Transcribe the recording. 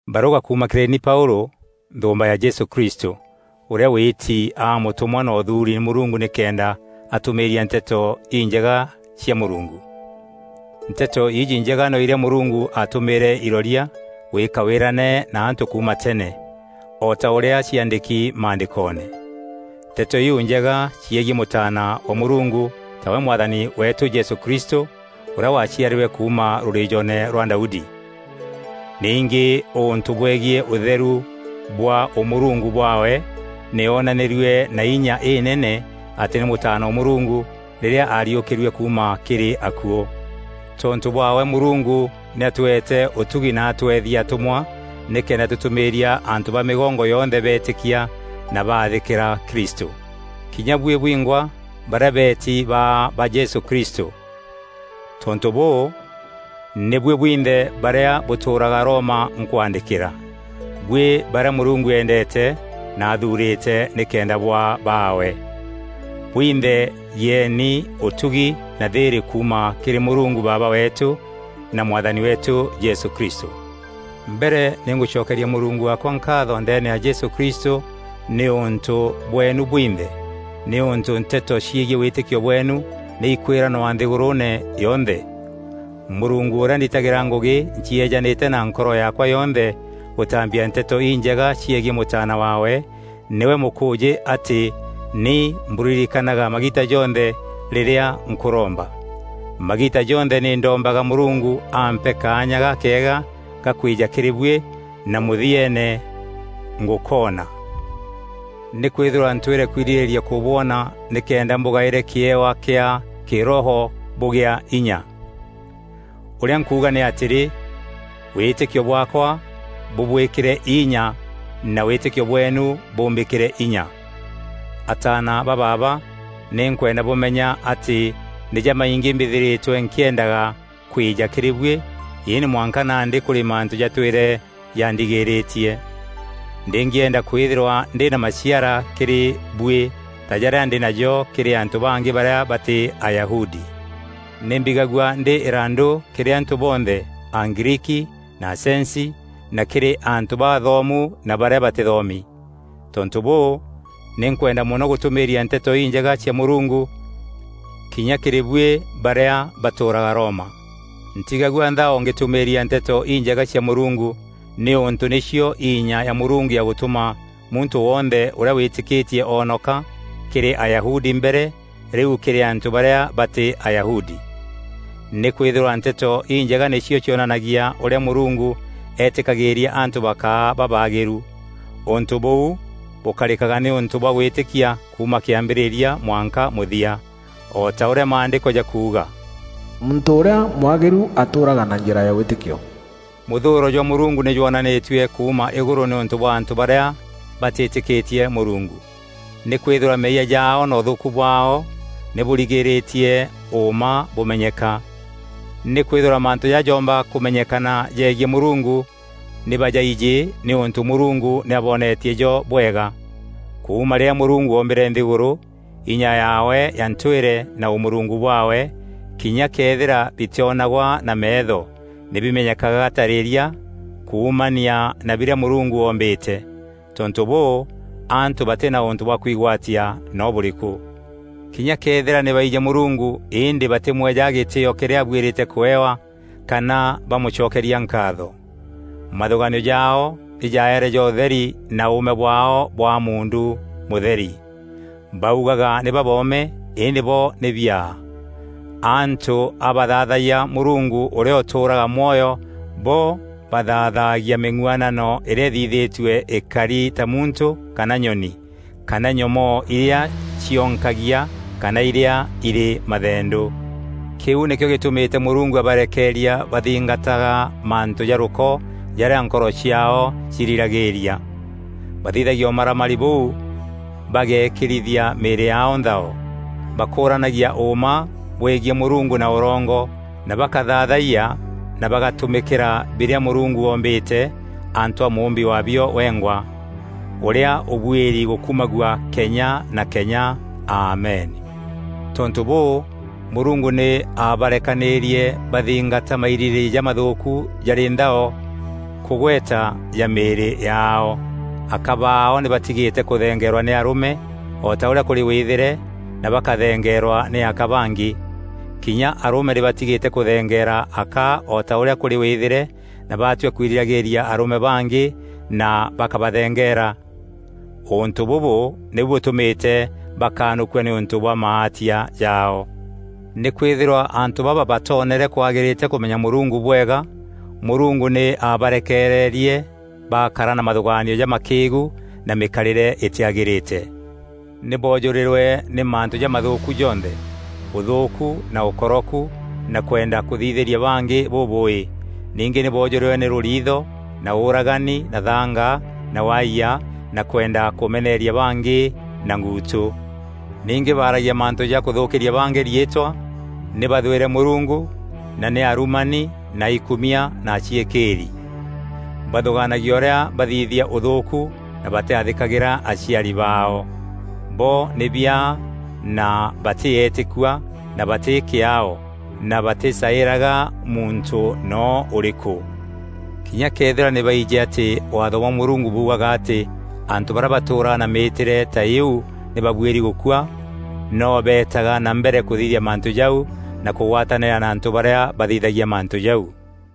Barûga kuuma kîrî ni Paûlû, nthûûmba ya Jesû Kristû, ûrîa wîîti aa mûtûmwa na ûthuuri nî Mûrungu nîkenda atûmîîria Nteto Injega cia Mûrungu. Nteto îîjî Njega no irîa Mûrungu aatumîîre iroria gwîîka wîrane na antû kuuma tene, o ta ûrîa ciaandîki Maandîkoone. Nteto iu Njega ciegiî Mûtaana wa Mûrungu, tawe Mwathani weetû Jesû Kristû, ûrîa waaciarîrwe kuuma rûrîîjoone rwa Daudi. Ningî ûntû bwegiî ûtheru bwa ûmûrungu bwaawe, nî onanîrue na inya înene atî nî Mûtaana wa Mûrungu rîrîa aariûkîrue kuuma kîrî akuû. Tontû bwaawe Mûrungu nî atûete ûtugi na atûethia atûmwa nîkenda tûtûmîîrîria antû ba mîgongo yonthe beetîkia na baathîkîra Kristû; kinya buî bwingwa, barîa beetî baa ba Jesû Krîstû. Tontû bûû, nî buî bwinthe barîa bûtûûraga Roma nkwaandîkîra, buî barîa Mûrungu eendeete na athuurîte nîkenda bwaa baawe. Bwinthe gîeeni ûtugi na thîîrî kuuma kîrî Mûrungu Baaba weetû na Mwathani weetû Jesû Kristû. Mbere nî ngûcokeeria Mûrungu waakwa nkaatho ndeene ya Jesû Kristû nîûntû bweenu bwinthe, nîûntû nteto ciegiî wîtîkio bweenu nî ikwîranwa nthîgûrûûne yonthe. Mûrungu ûrîa nditagîra ngûgî ncieejanîte na nkoro yaakwa yonthe gûtambia Nteto Injega ciegiî Mûtaana waawe, nîwe mûkûûjî atî nî mbûririkanaga magiita jonthe rîrîa nkûromba. Magiita jonthe nî ndombaga Mûrungu ampe kaanya gakeega ga kwîja kîrî buî na mûthieene ngûkoona. Nîkwîthîrwa ntwîre kwirîrîria kûbwona nîkenda mbûgaîre kîewa kîa kîroho bûgîa înya. Ûrîa nkuuga nî atîrî, wîtîkio bwaakwa bûbwîkîre inya na wîtîkio bweenu bûmbîkîre inya. Ataana ba baaba nî nkwenda bûmenya atî nî jamaingî mbîthîrîtwe nkîendaga kwîja kîrî buî, îndî mwanka nandî kûrî mantû jatwîre jandigîrîtie. Ndîngîenda kwîthîrwa ndî na maciara kîrî buî ta jarîa ndî najo kîrî antû bangî barîa batî Ayahudi. Nî mbigagua ndî îrandû kîrî antû bonthe: Agriiki na acenci na kîrî antû baathomu na barîa batîthomi. Tontû bûû, nî nkwenda mono gûtûmîîria Nteto Injega cia Mûrungu kinya kîrî buî barîa batûûraga Roma. Ntiigagua nthao ngîtûmîîria Nteto Injega cia Mûrungu, nîûntû nîcio inya ya Mûrungu ya gûtûma muntû wonthe ûrîa wîtîkîtie oonoka: kîrî Ayahudi mbere, rîu kîrî antû barîa batî Ayahudi. Nîkwîthîrwa Nteto Injega nîcio cionanagia ûrîa Mûrungu eetîkagîîria antû bakaa babaagîru. Ûntû bûu bûkarîkaga nîûntû bwa gwîtîkia kuuma kîambîrîria mwanka mûthia. O ta ûrîa Maandîko jakuuga, “Muntû ûrîa mwagîru atûûraga na njîra ya wîtîkio.” Mûthûûro jwa Mûrungu nî jwonanîtue kuuma îgûrû nîûntû bwa antû barîa batîtîkîtie Mûrungu. Nîkwîthîrwa meeyia jaao na ûthûûku bwaao nî bûrigîîrîtie ûûma bûmenyeka. Nîkwîthîrwa mantû jarîa joomba kûmenyekana jegiî Mûrungu, nî bajaijî nîûntû Mûrungu nî aboonetie jo bwega. Kuuma rîrîa Mûrungu oombîre nthîgûrû, inya yaawe ya ntwîre na ûmûrungu bwaawe, kinya këethîra bitîonagwa na meetho, nî bimenyekaga tarîîria kuumania na birîa Mûrungu ombîte. Tontû bûû, antû batî na ûntû bwa kwigwatia no bûrîkû. Kinya këethîra nî baijî Mûrungu îndî batîmwejaga gîtîîo kîrîa abuîri kûewa, kana bamûcokeria nkaatho. Mathûgaanio jaao nî jaeere ja ûtheri na ûûme bwaao bwaa muundu mûtheri. Baugaga nî baboome, îndî bo nî biaa. Antû a bathaathayia Mûrungu ûrîa ûtûûraga mwoyo, bo bathaathagia mîng'uanano îrîa îthithîtue îkari ta muntû kana nyoni, kana nyomoo irîa cionkagia kana irîa irî mathendû. Kîu nîkîo gîtûmîte Mûrungu abarekeeria bathingataga mantû ja rûko jarîa nkoro ciaao ciirîragîîria. Bathithagia ûmaramari bûu bageekîrithia mîîrî yaao nthao. Bakûûranagia ûûma bwegiî Mûrungu na ûrongo na bakathaathayia na bagatumîkîra birîa Mûrungu oombîte antû a mûûmbi waabio wengwa, ûrîa ûbuîri gûkumagua kenya na kenya! Amen. Tontû bûû, Mûrungu nî aabarekanîîrie bathingata mairîrîîria jamathûûku jarî nthao kûgweta ja mîîrî yaao. Aka baao nî batigîte kûthengeerwa nî arûme o ta ûrîa kûrî wîthîre na bakathengeerwa nî aka bangî. Kinya arûme nî batigîte kûthengeera aka o ta ûrîa kûrî wîthîre na batua kwirîragîîria arûme bangî na bakabathengeera. Ûntû bûbû nîbû bûtûmîte bakanûkua nîûntû bwa maatia jaao. Nîkwîthîrwa antû baba batoonere kwagîrîte kûmenya Mûrungu bwega, Mûrungu nî aabarekeererie bakara na mathûgaanio jamakîîgu na mîkarîre îtîagîrîte. Nî boojûrîrwe nî mantû jamathûûku jonthe: ûthûûku na ûkoroku na kwenda kûthithîria bangî bûbûûî; ningî nî boojûrîrwe nî rûriitho na ûûragani na thaanga na waayia na kwenda kûmeneeria bangî na nguutû. Ningî baaragîa mantû ja kûthûkîria bangî riîtwa, nî bathwîre Mûrungu na nî arumani na aikumia na aciîkîîri. Bathûgaanagia ûrîa bathithia ûthûûku na batîathîkagîra aciari baao. Bo nî biaa na batî eetîkua na batî kîaao na batîcaîraga muntû noo ûrîkû. Kinya këethîra nî baijî atî Waatho bwa Mûrungu buugaga atî antû barîa batûûraga na mîîtîre ta îîu nî babuîri gûkua, noo beetaga na mbere kûthithia mantû jau na kûgwatanîra na antû barîa bathithagia mantû jau.